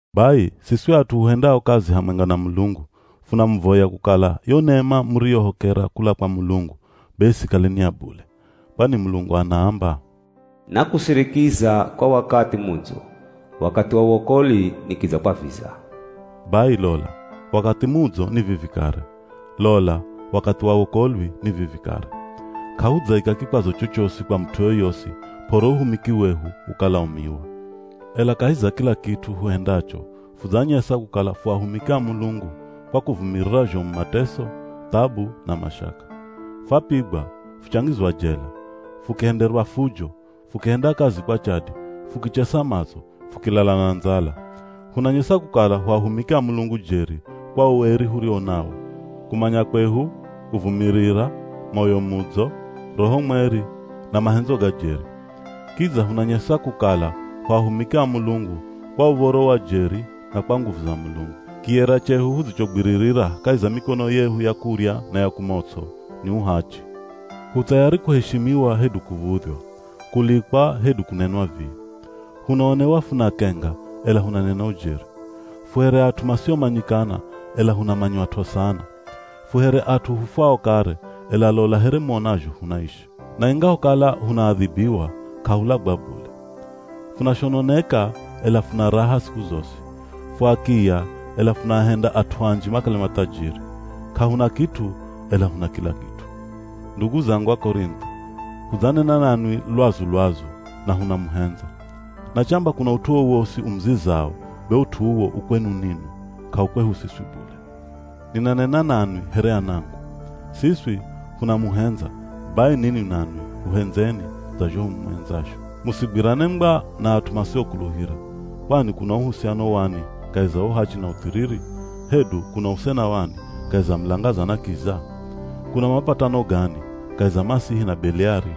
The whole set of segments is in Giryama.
Bai siswi at'u huhendao kazi hamwenga na Mulungu, funamuvoya kukala yo nema muriyohokera kula kwa Mulungu be isikale ni ya bule. Kwani Mulungu anaamba, “Nakusirikiza kwa wakathi mudzo, Wakathi wa wokolwi nikidzakwaviza.” Bai, lola! Wakathi mudzo ni vivi kare, lola wakathi wa wokolwi ni vivi kare. K'ahudzaika kikwazo chochosi kwa mut'u yoyosi p'ore uhumiki wehu ukalaumiwa. Ela kahi za kila kit'u huhendacho fudzanyesa kukala fu ahumiki a Mulungu kwa kuvumirira zhomu mateso, thabu, na mashaka. Fapigwa, fuchangizwa jela, fukihenderwa fujo, fukihenda kazi kwa chadi, fukichesa matso, fukilala na ndzala. Hunanyesa kukala hu ahumiki a Mulungu jeri kwa ueri huriwo nawo, kumanya kwehu, kuvumirira, moyo mudzo, Roho Mweri, na mahendzo ga jeri. Kidza hunanyesa kukala hu ahumiki a Mulungu kwa uv̱oro wa jeri na kwa nguvu za Mulungu. Kiyera chehu hudzichogwirira kahi za mikono yehu ya kurya na ya kumots'o, ni uhachi. Hu thayari kuheshimiwa hedu kuv̱udhywa; kulikwa hedu kunenwa vii. Hunaonewa funakenga ela hunanena ujeri. Fu here at'u masiomanyikana ela hunamanywat'o sana. Fu here at'u hufwao kare, ela lola here muonazho hunaishi. Na ingahokala hunaadhibiwa, k'ahulagwa bule. Funashononeka ela funa raha siku zosi. Fu akiya ela funaahendya at'u anji makale mathajiri. K'ahuna kit'u ela huna kila kit'u. Ndugu zangu Akorintho, hudzanena nanwi lwazu-lwazu, na hunamuhendza. Na chamba kuna ut'u wowosi umuzizao be ut'u uwo u kwenu ninwi, k'au kwehu siswi bule. Ninanena nanwi here anangu. Siswi hunamuhendza, bai ninwi nanwi huhendzeni dza zho humuhendzazho. Musigwirane ngwa na at'u masiokuluhira. Kwani kuna uhusiano wani kahi za uhachi na uthiriri? Hedu kuna usena wani kahi za mulangaza na kiza? Kuna mapatano gani kahi za Masihi na Beliari?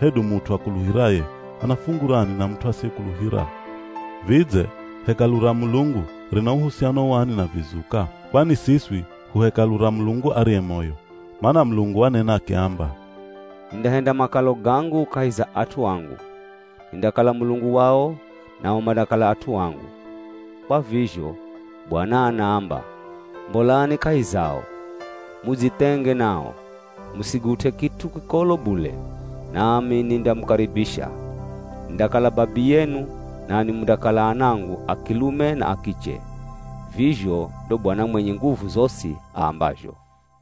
Hedu mut'u akuluhiraye, ana fungu rani na mut'u asiyekuluhira? Vidze, Hekalu ra Mulungu, rina uhusiano wani na vizuka? Kwani siswi hu Hekalu ra Mulungu ariye moyo. Mana Mulungu wanena akiamba, “Nindahenda makalo gangu kahi za at'u angu. Nindakala Mulungu wao nao mandakala at'u angu.” Kwa vizho, “Bwana anaamba, Mbolani kahi zao, mudzithenge nao. Musigut'e kit'u kikolo bule, nami nindamukaribisha. Nindakala Babiyenu nanwi mundakala anangu a kilume na a kiche. Vizho ndo Bwana mwenye nguvu zosi aambazho.”